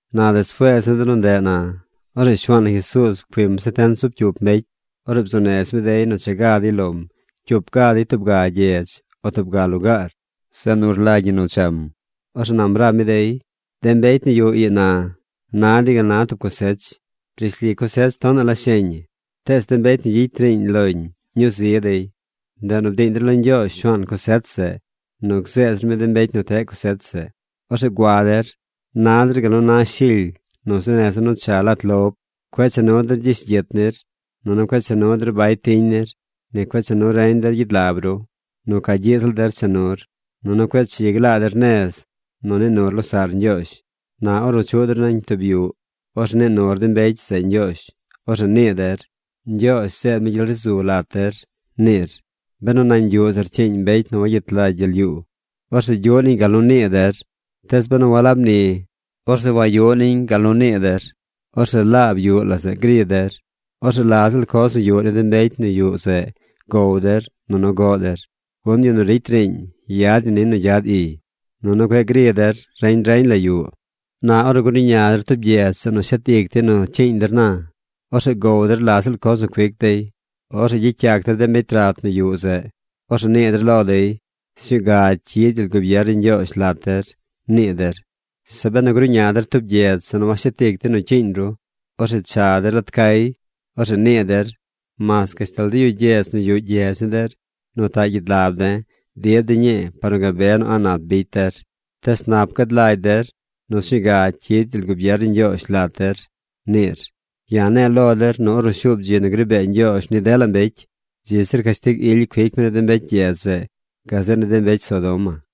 Na despuees ni de nu ndeꞌ na, orzeꞌ Shuaan na Jesuuz pcuim setent zub cyup mbecy. Orzeꞌ bzuu nez mi dey nu cha ga dey lom cyup ga dey tub ga gyedz o tub ga lugaar, zeꞌ nu rlagy ñi nu cham. Orzeꞌ nam rab mi dey: ―De mbecy nu yuꞌ ii na na dey gal na tub cosech. Rishli cosech tonaꞌ la sheñ ñi. Tees de mbecy nu gyicy riiñ loñ ñuu zi dey. Ndeꞌ nu bdiiñ der lo Ñgyoozh Shuaan cosech zeꞌ nu gzeed zir mi de mbecy nu teꞌ cosech zeꞌ. Orzeꞌ gua der. Na der gal nu na shily nu zuu neza̱ nu cha lat lob. Cueꞌ cha nu der gyish gyit nir, nunu cueꞌ cha nu der bay tiñ nir. Ni cueꞌ cha nu reñ der gyid lab ru. Nu ca gyiꞌ ziꞌl der cha nur. Nunu cueꞌ chi glaa der nez nu nii nur losaꞌr ñgyoozh. Na ornu chuꞌ der nañ tub yuꞌ, orzeꞌ nii nur de mbecy zeꞌ ñgyoozh. Orzeꞌ nii der: “Ñgyoozh zeed mi gyel ri zu lat der”, niir. Benu nañ yuꞌ zeꞌ rcyiiñ mbecy nu wagyet lagy gyel yuu, orzeꞌ gyuꞌ niñ gal nu mnii der. Tees benu walab ni, orzeꞌ wayuꞌ niñ gal nu mnii der. Orzeꞌ laab yuꞌ la zeꞌ gri der. Orzeꞌ la ziꞌl coz nu yuꞌ ni de mbecy nu yuꞌ zeꞌ gow der nunu goꞌ der. Gun yu nu ricy riiñ yad ñi niy nu gyad iy. Nunu cueꞌ gri der reñ reñ la yuꞌ. Na ornu gruꞌña der tub gyedz zeꞌ nu shet ic dey nu cyiiñ der na, orzeꞌ gow der la ziꞌl coz nu cuic dey. Orzeꞌ gyicy yac der de mbecy rat nu yuꞌ zeꞌ. Orzeꞌ nii der lo dey: “Sñuu ga cyid gyel gubier ni Ñgyoozh lat der”, nii der. Zeꞌ benu gruꞌña der tub gyedz zeꞌ nu washet ic dey nu cyiiñ ru, orzeꞌ cha der lat cay. Orzeꞌ nii der: “¡Mas gashtal de yu gyedz nu yuꞌ gyedz ni der nu taꞌ gyid lab de̱ dib de̱ ñii par nu gabe nu a̱ꞌ nap bicy der! Tees nap gad lagy der nu sñuu ga cyid gyel gubier ni Ñgyoozh lat der”, niir. Ya̱ ne̱e̱ lo der nu ornu shuub dzi nu gri bee Ñgyoozh ni dela mbecy, dzi zir cashtig ily cuic mi ni de mbecy gyedz zeꞌ gazeꞌ ni de mbecy Sodoma.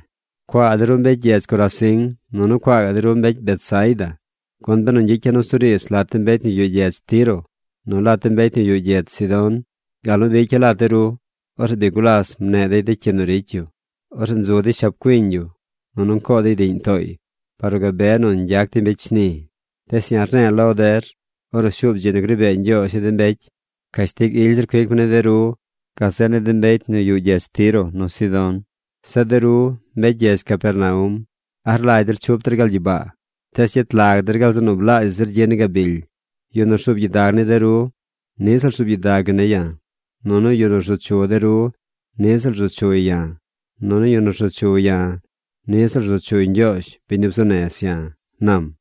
’¡Cuaa de ru mbecy gyedz Corazín! ¡Nunu cuaa gaꞌ de ru mbecy Betsaida! Gun benu ñgyicy ya̱ nusuriidz lat de mbecy nu yuꞌ gyedz Tiro nu lat de mbecy nu yuꞌ gyedz Sidón gal nu bicya̱ lat de ru, orzeꞌ bi gulas mneꞌ dey de cyi nu ricy yu. Orzeꞌ nzu dey shab cuiñ yu, nunu ncoo dey diꞌñ tooy par nu gabe nu ñgyac dey mbecy shni. Tees ya̱ rne̱e̱ lo der ornu shuub dzi nu gri bee Ñgyoozh ni de mbecy, cashtig ily zir cuic mi ni de ru gazeꞌ ni de mbecy nu yuꞌ gyedz Tiro nu Sidón. Zeꞌ de ru mbecy gyedz Capernaum, ¿a rlagy der chup der gal gyibaa? Tees gyet lag der gal zeꞌ nu blaazhaꞌ zir gyi ni gabily. ’Yu nu rzuub gyidag ni de ru niꞌ ziꞌl rzuub gyidag yu ne̱ ya̱. Nunu yu nu rzu chu de ru niꞌ ziꞌl rzu chuy ya̱. Nunu yu nu rzu chu ya̱, niꞌ ziꞌl rzu chuy Ñgyoozh, biñ nu bzuu nez ya̱ ―nam.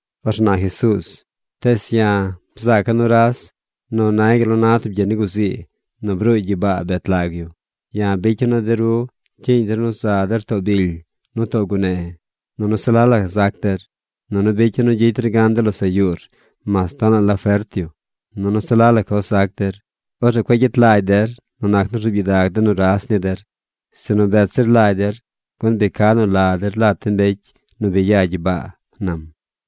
Orzeꞌ na Jesuuz: ―Tees ya̱ bzaaca̱ nuras nu nay gal nu na tub gyi ni guzii nu bruuy gyibaa bet lag yu. Ya̱ bicya̱ nu de ru cyiiñ der nu zar too bily nu too gune, nunu se la la zac der. Nunu bicya̱ nu gyicy der gan dela losaꞌ yuur mas tonaꞌ la fert yu. Nunu se la la coz zac der. Orzeꞌ cueꞌ gyet lagy der nu nac nu rzuub gyidag de nuras ni der, sinu bet zir lagy der gun bi ca nu la der lat de mbecy nu bi ya gyibaa ―nam.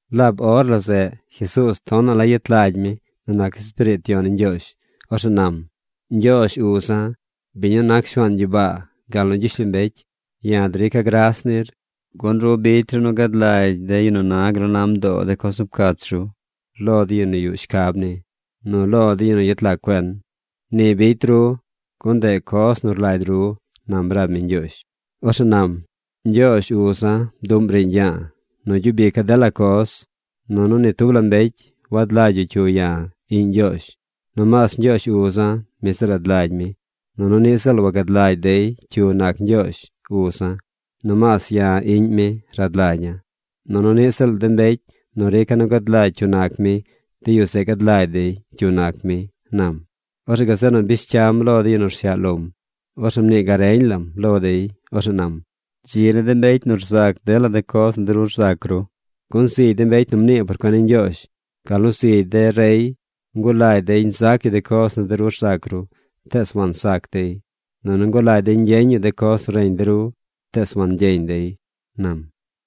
Laab or la zeꞌ Jesuuz tonaꞌ la yet lagy mi nu nac Espiriit Yon ni Ñgyoozh. Orzeꞌ nam: ―Ñgyoozh uza̱, biñ nu nac Shuaan gyibaa gal nu gyishlombecy, ya̱ drica̱ gras nir gun ru bicy ru nu gad lagy de yu nu na gal nu na mdoo de coz nu pcach ru lo de yu nu yuꞌ shcab ni, nu lo de yu nu yet lag cuen. Ni bicy ru gun ndeꞌ coz nu rlagy ru ―nam rab mi Ñgyoozh. Orzeꞌ nam: ―Ñgyoozh uza̱ bduꞌm riiñ ya̱a̱ nu gyub ica̱ dela coz. Nunu ni tub la mbecy wad lagy yu cyu ya̱, iꞌñ Ñgyoozh. Nomaas Ñgyoozh uza̱, mi zeꞌ rad lagy mi. Nunu niꞌ ziꞌl wagad lagy dey cyu nac Ñgyoozh, uza̱. Nomaas ya̱ iꞌñ mi rad lagya̱. Nunu niꞌ ziꞌl de mbecy nu rica̱ nu gad lagy cyu nac mi, de yu zeꞌ gad lagy dey cyu nac mi ―nam. Orzeꞌ gazeꞌ nu bish cyam lo de yu nu rsyaꞌ lom. Orzeꞌ mnii gareñ lam lo dey. Orzeꞌ nam: ―Dzi ni de mbecy nu zac dela coz nu de ru rzac ru. Gun zigy de mbecy nu mnii por cuen ni Ñgyoozh, gal nu zigy de rey ngulagy dey nzac yu de coz nu de ru rzac ru, tees wansac dey. Nunu ngulagy dey ñgyeñ yu de coz nu reñ de ru, tees wangyeñ dey ―nam.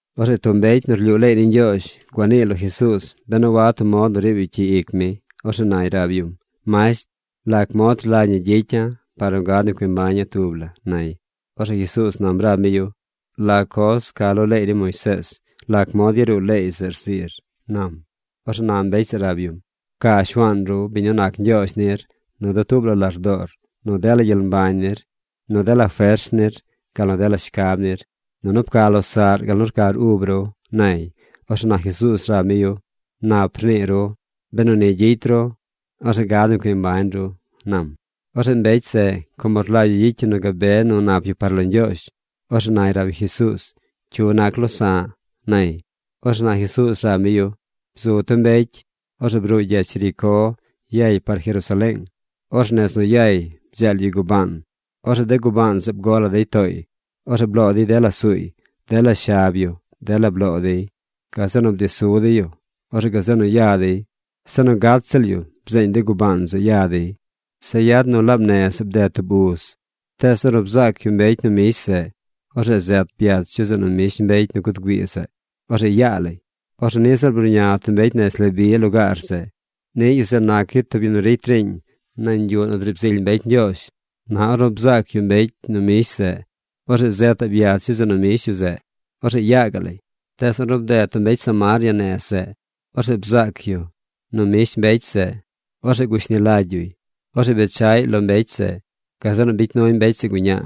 Orzeꞌ tub mbecy nu rlyuu leey ni Ñgyoozh gua niiy lo Jesuuz ben a wad tub mod nu riib yu cyi ic mi. Orzeꞌ nay rab yum: ―Masht, ¿lac mod rlagy ñi gyicya̱ par nu gad nu cui mbaña̱ tub la? ―nay. Orzeꞌ Jesuuz nam rab mi yu: ―¿La coz ca lo leey ni Moisees? ¿Lac mod yaruu leey zeꞌ rziir? ―nam. Orzeꞌ na mbecy zeꞌ rab yum: ―Pca Shuaan ru, biñ nu nac Ñgyoozh nir, nu dutuub la lardoor nu dela gyel mbañ nir, nu dela fers nir, gal nu dela shcab nir. Nunu pca losaꞌr gal nu rcar ub ru ―nay. Orzeꞌ na Jesuuz rab mi yu: ―Nap rnii ru. Benu ni gyicy ru, orzeꞌ gad nu cui mbañ ru ―nam. Orzeꞌ mbecy zeꞌ, como rlagy yu gyicy yu nu gabe nu nap yu par lo Ñgyoozh, orzeꞌ nay rab yu Jesuuz: ―¿Cyu nac losa̱ꞌ? ―nay. Orzeꞌ na Jesuuz rab mi yu: ―Bzu tub mbecy. Orzeꞌ bruuy gyedz Jericó yay par Jerusaleeng. Orzeꞌ nez nu yay bdzeel yu gubaan. Orzeꞌ de gubaan zeꞌ bgo la dey tooy. Orzeꞌ bloo dey dela suuy. Dela shab yu, dela bloo dey. Gazeꞌ nu bdi su dey yu. Orzeꞌ gazeꞌ nu ya dey. Se nu gat ziꞌl yu bzeeñ de gubaan zeꞌ ya dey. Zeꞌ yad nu laab ziꞌl nez zeꞌ bded tub uz. Tees ornu bzaac yu mbecy nu mbish zeꞌ, orzeꞌ zet byach yu zeꞌ nu mbish mbecy nu guud güii zeꞌ. Orzeꞌ yaa lay. Orzeꞌ niꞌ ziꞌl bruꞌña tub mbecy nez Leví lugaar zeꞌ. Niꞌ yu zeꞌ nac yu tub yu nu ricy riiñ nañ yuꞌ nu driib zily mbecy Ñgyoozh. Na ornu bzaac yu mbecy nu mbish zeꞌ, orzeꞌ zetaꞌ byach yu zeꞌ nu mbish yu zeꞌ. Orzeꞌ yaa gaꞌ lay. Tees ornu bded tub mbecy Samaria nez zeꞌ, orzeꞌ bzaac yu nu mbish mbecy zeꞌ. Orzeꞌ gushni lagy yuy. Orzeꞌ bechaꞌy lo mbecy zeꞌ. Gazeꞌ nu bicy nuy mbecy zeꞌ guñaa.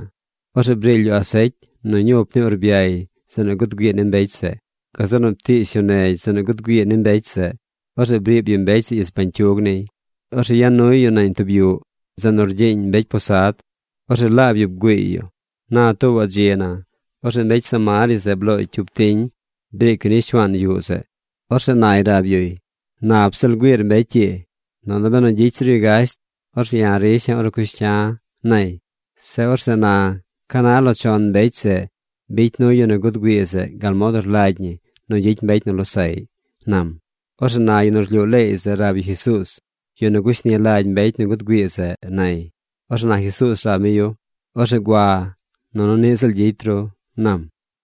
Orzeꞌ briily yu asecy nu ñup ni urbyay zeꞌ nu guud güii ni mbecy zeꞌ. Gazeꞌ nu ptiish yu negy zeꞌ nu guud güii ni mbecy zeꞌ. Orzeꞌ briib yu mbecy zeꞌ ich bañcyug niy. Orzeꞌ ya nuy yu nañ tub yuꞌ, zeꞌ nu rgyiiñ mbecy posad. Orzeꞌ laab yu bgüiiy yu. Na tuubaꞌ dzi na, orzeꞌ mbecy Samaria zeꞌ blooy cyup tiñ briic yu ni shuaan yuꞌ zeꞌ. Orzeꞌ nay rab yuy: “Nap ziꞌl güiir mbecy ii. Nunu benu gyicy zir yu gasht, orzeꞌ ya̱ risha̱ ornu cush cya̱”, nay. Zeꞌ orzeꞌ na, ¿ca na lo chon de mbecy zeꞌ bicy nuy yu nu guud güii zeꞌ gal mod nu rlagy ñi nu gyicy mbecy nu losaꞌy? ―nam. Orzeꞌ na yu nu rlyuu leey zeꞌ rab yu Jesuuz: ―Yu nu gushni lagy mbecy nu guud güii zeꞌ ―nay. Orzeꞌ na Jesuuz rab mi yu: ―Orzeꞌ gua nunu niꞌ ziꞌl gyicy ru ―nam.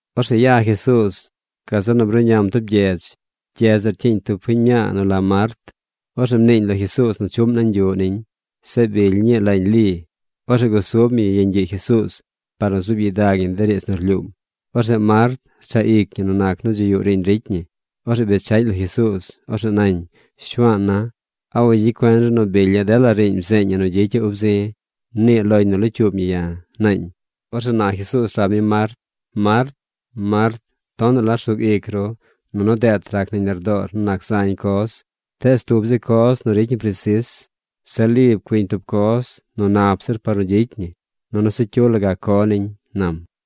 Orzeꞌ ya Jesuuz. Gazeꞌ nu bruꞌñam tub gyedz. Gyedz zeꞌ rcyiiñ tub fiñ mñaa nu la Mart. Orzeꞌ mniiñ lo Jesuuz nu chuꞌm nañ yuꞌ niñ. Zeꞌ bily ñii lañ Li. Orzeꞌ gusub ñi yeñ gyiꞌ Jesuuz par nu zuub gyidag ñi de riidz nu rlyuum. Orzeꞌ Mart rchaꞌ ic ñi nu nac nu dzi yuꞌ riiñ ricy ñi. Orzeꞌ bechaꞌñ lo Jesuuz. Orzeꞌ nañ: ―Shuaana̱, ¿a wagyicy cuen ru nu bilya̱ dela riiñ bzeeñ ñi nu gyicya̱ ub zi̱? Mnii loñ nu locyuub ñi ya̱ ―naañ. Orzeꞌ na Jesuuz rab mi Mart: ―Mart, Mart tonaꞌ la rsug ic ru nunu deet rac nañ lardoor nu nac zañ coz. Tees tub zi coz nu ricy ñi presis. Zeꞌ Li pcuiñ tub coz nu nap zir par nu gyicy ñi. Nunu se cyu la gac co niñ ―nam.